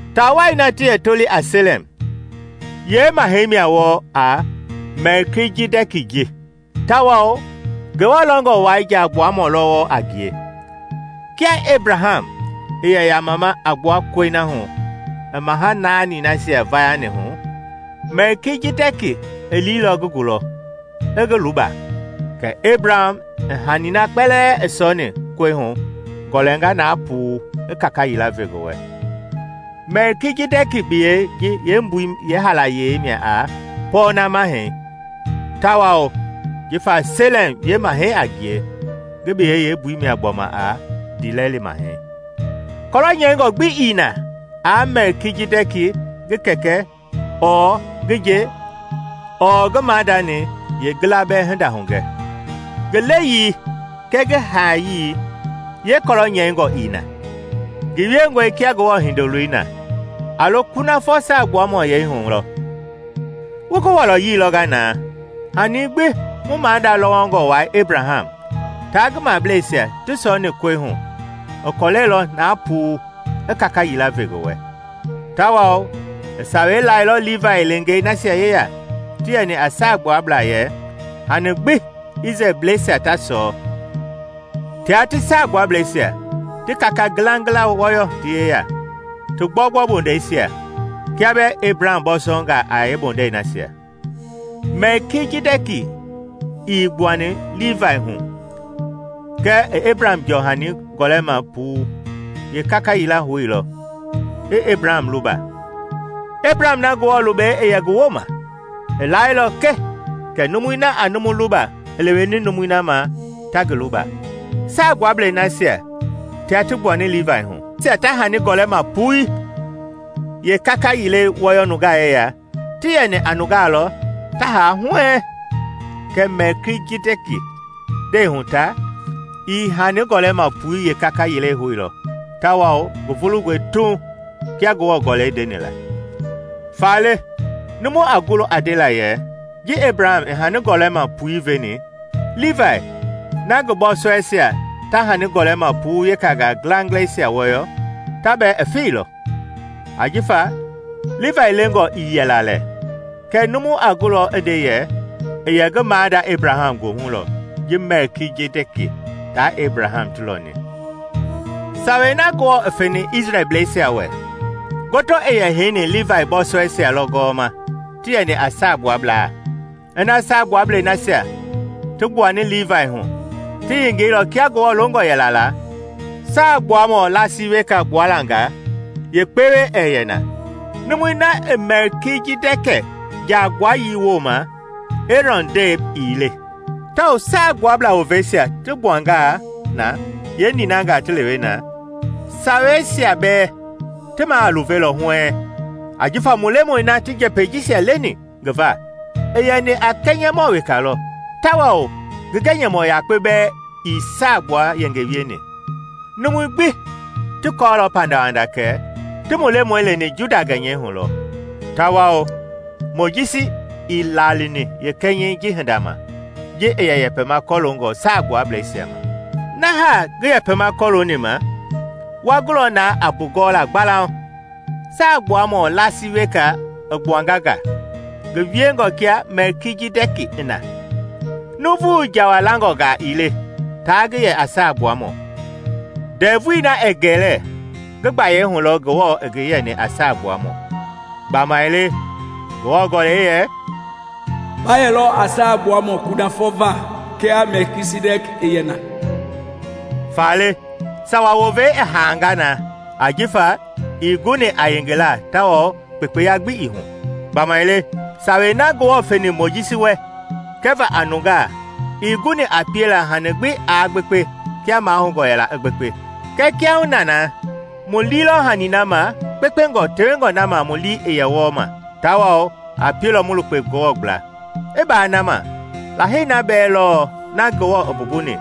Taa wai na ti yɛ toli a Selɛm yeemahɛi mia wɔɔ a Mɛlkijidɛki ji tawao Ngewɔ Lɛngɔ wai Jaagbuamɔ lɔ wɔɔ a ngie. Kia Ebraham i yɛ yamama a gbua kɔi na hu i maha naanisia vayani hu, Mɛlkijidɛki i liilɔ ngi gulɔ i ngi luba, kɛ Ebraham i hani na kpɛlɛɛ i sɔɔni kɔi hu gɔlɛnga na puu i kaka yila ve ngi wɛ. (Mɛlkijidɛki biyɛi ji yeembui yeehaalayei mia a “Pɔɔna Mahɛi;” Tawao jifa Selɛm yeemahɛi a ngie, ngi biyɛi yeembui mia gbɔma a “Ndiilɛli Mahɛi.”) Kɔlɔ nyɛingɔ gbi ii na aa Mɛlkijidɛki ngi kɛkɛ ɔɔ ngi nje ɔɔ ngi maadani yeengila bɛɛ hinda hugɛ; ngi leyii kɛɛ ngi haayii yeekɔlɔ nyɛingɔ ii na. Ngi wiengɔe kia Ngewɔ Hindoloi na; a lo kunafɔ Saagbuamɔyɛi hu lɔ. Wu ngi wɔlɔyii lɔnga na. Hani gbi mu maada lɔwɔngɔ wai Ebraham taa ngi mablɛisia ti sɔɔni kɔi hu, i kɔlɛilɔ na puu i kaka yila ve ngi wɛ. Tawao i Sawei lailɔ Livai leengei nasia yeya ti yɛni a saagbuablaa yɛ hani gbi Isrɛlbleisia ta sɔɔ, ti yɛ a kɔlɛ na puu, tia ti Saagbuablɛisia ti kaka ngilangila wɔyɔ ti yeya, ti gbɔugbɔu bondɛisia, kia bɛɛ Ebraham bɔɔsɔngaa a yeembondɛi nasia. Mɛlkijidɛki ii gbuani Livai hu, kɛɛ i Ebraham jɔɔhani gɔlɛma puu, yeekaka yila houilɔ i Ebraham luba, Ebraham na Ngewɔ lubɛi i yɛ ngi wooma. I laailɔ ke kɛ numui na a numu luba i leweni numui na ma ta ngi luba. Saagbuablei nasia tia ti gbuani Livai hu, nasia ta hani gɔlɛma pui yeekaka yilei wɔyɔ nungaa yeya, ti yɛni a nungaa lɔ ta haa huɛɛŋ; kɛɛ Mɛlkijidɛki ndɛi hu ta, i hani gɔlɛma pui yeekaka yilei houilɔ tawao ngi vulungɔe tuuŋ kia Ngewɔ Gɔlɛi ndeni la. Faale numu a gulɔ a ndela yɛ ji Ebraham i hani gɔlɛima pui veni, Livai (na ngi bɔɔsɔɛisia ta hani gɔlɛma puu yeekaka ngilangilɛisia wɔyɔ) ta bɛɛ i feilɔ. Ajifa Livai lengɔ ii yɛla lɛ, kɛɛ numu a gulɔ i nde yɛ, i yɛ ngi maada Ebraham goohu lɔ ji Mɛlkijidɛki taa Ebraham ti lɔni. Sawei na Ngewɔ i feni Isrɛlbleisia wɛ ngoto i yɛ heini livai bɔɔsɔɛisia lɔ gɔwɔma ti yɛni a saagbuablaa. Ina saagbuablei nasia ti gbuani livai hu ti yengeilɔ kia Ngewɔ longɔ yɛla la, saagbuamɔ laasi weka gbuala nga yeekpewe ɛɛ yɛ na, numui na i Mɛlkijidɛki jaagbuayii wooma, Eerɔn ndɛi ii le. Tawao Saagbuablaa woveisia ti gbuangaa na yeeninangaa ti lewe na, saweisia bɛɛ ti maa a luvelɔ huɛɛŋ. Ajifa mu Lemɔi na ti njɛpɛi jisia leni ngi va, i yɛni a kɛnyɛmɔ weka lɔ, tawao ngi gɛnyɛmɔ yakpe bɛɛ ii saagbua yenge wieni. Numui gbi ti kɔɔlɔ pandawanda kɛ ti mu Lemɔi leni Juda gɛnyɛi hulɔ; tawao Mojisi ii laalini yeekɛnyɛi ji hinda ma ji i yɛ yɛpɛma kɔloongɔ Saagbuablɛisia ma. Na haa ngi yɛpɛma kɔlooni ma wa gulɔ na a mbugɔɔla gbalauŋ; Saagbuamɔ laasi weka i gbuanga nga, ngi wiengɔ kia Mɛlkijidɛki i na. Nuuvu Jawa langɔngaa ii le taa ngi yɛ a Saagbuamɔ; ndɛvui na ɛɛ gɛlɛ, ngi gbayei hu lɔ Ngewɔ i ngi yɛni a Saagbuamɔ. Gbamaile Ngewɔ Gɔlɛi yɛ, “Ba yɛlɔ a Saagbuamɔ kunafɔ va kia Mɛlkijidɛki i yɛ na.” Faale sawa wovei i haanga na ajifa ii guni a yengela tawao kpekpeya gbi ii hu. Gbamaile Sawei na Ngewɔ feni Mojisi wɛ kɛva a nungaa ii guni a piela hani gbi aa gbekpe kia mahoungɔ yɛla i gbekpe. Kɛɛ kiahuna na mu lii lɔ hani na ma kpekpengɔ tewengɔ na ma mu lii i yɛ wɔɔ ma, tawao a pielɔ mu lukpe Ngewɔ gbla. I baa na ma, Lahei na bɛɛ lɔ na Ngewɔ i mbumbuni.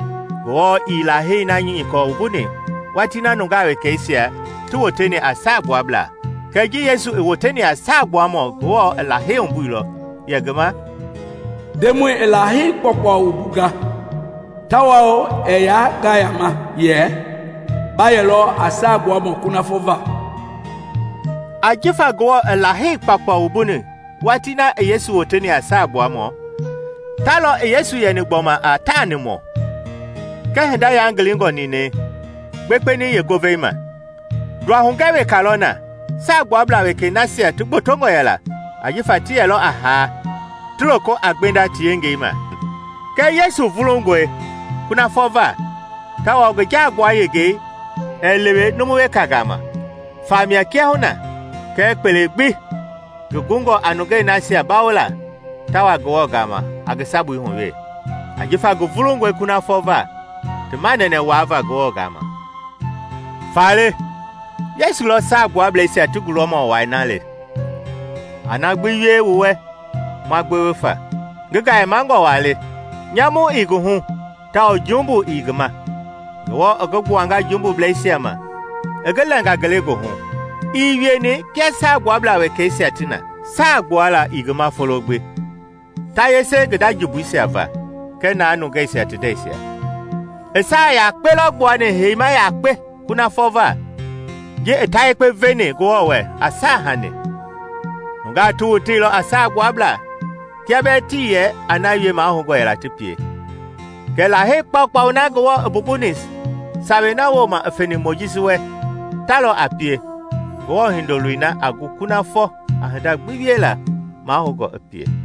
Ngewɔ ii Lahei na nyikɔ wumbuni watii na nungaa wekeisia ti woteni a saagbuablaa. Kɛɛ ji Yesu i woteni a saagbuamɔ Ngewɔ i Lahei wumbuilɔ yɛ ngi ma, “Ndemɔi i Lahei kpaukpau wumbunga tawao ɛɛ yaa ngayama, yɛ, ‘Ba yɛlɔ a Saagbuamɔ kunafɔ va.’” Jifa Ngewɔ i Lahei kpaukpau wumbuni watii na i Yesu woteni a Saagbuamɔ, ta lɔ i Yesu yɛni gbɔma a taanimɔ kɛ hinda yangilingɔ ninɛi i gbekpeni yeengovei ma. Nduahugɛ weka lɔ na: saagbuablaa wekei nasia ti gbotongɔ yɛla ajifa ti yɛlɔ a haa ti loko a gbenda ti yengei ma. Kɛɛ Yesu vulungɔe kunafɔ va tawao ngi jaagbua yengei ɛɛ lewe numu weka gama. Famia kiahuna, kɛɛ kpele gbi ngi gungɔ a nungei nasia bawola ta wa Ngewɔ gama a ngi sabui hu we, ajifa ngi vulungɔe kunafɔ va ti manɛnɛ wuava Ngewɔ gama. Faale Yesu lɔ Saagbuablɛisia ti gulɔmɔ wai na le, a na gbi wie mu wɛ ma gbewe fa. Ngi gayemangɔ waa le; nyamu ii ngi hu tawao jumbu ii ngi ma; Ngewɔ i ngi gbuanga jumbubleisia ma i ngi lɛnga ngelegoohu. Ii wieni kia Saagbuabla wekeisia ti na; saa gbuala ii ngi ma folo gbi, ta yese ngi nda jumbuisia va kɛɛ na nungeisia ti ndɛisia. I saa yakpe lɔ gbuani heima yakpe kunafɔ va, ji i ta yekpe veni Ngewɔ wɛ a saahanii. Nungaa ti woteilɔ a saagbuablaa kia bɛɛ tii yɛ a na wie mahoungɔ yɛla ti pie, kɛɛ Lahei kpaukpau na Ngewɔ i mbumbuni Sawei na wooma i feni Mojisi wɛ ta lɔ a pie Ngewɔ Hindoloi na a gu kunafɔ a hinda gbi wiela mahoungɔ i pie.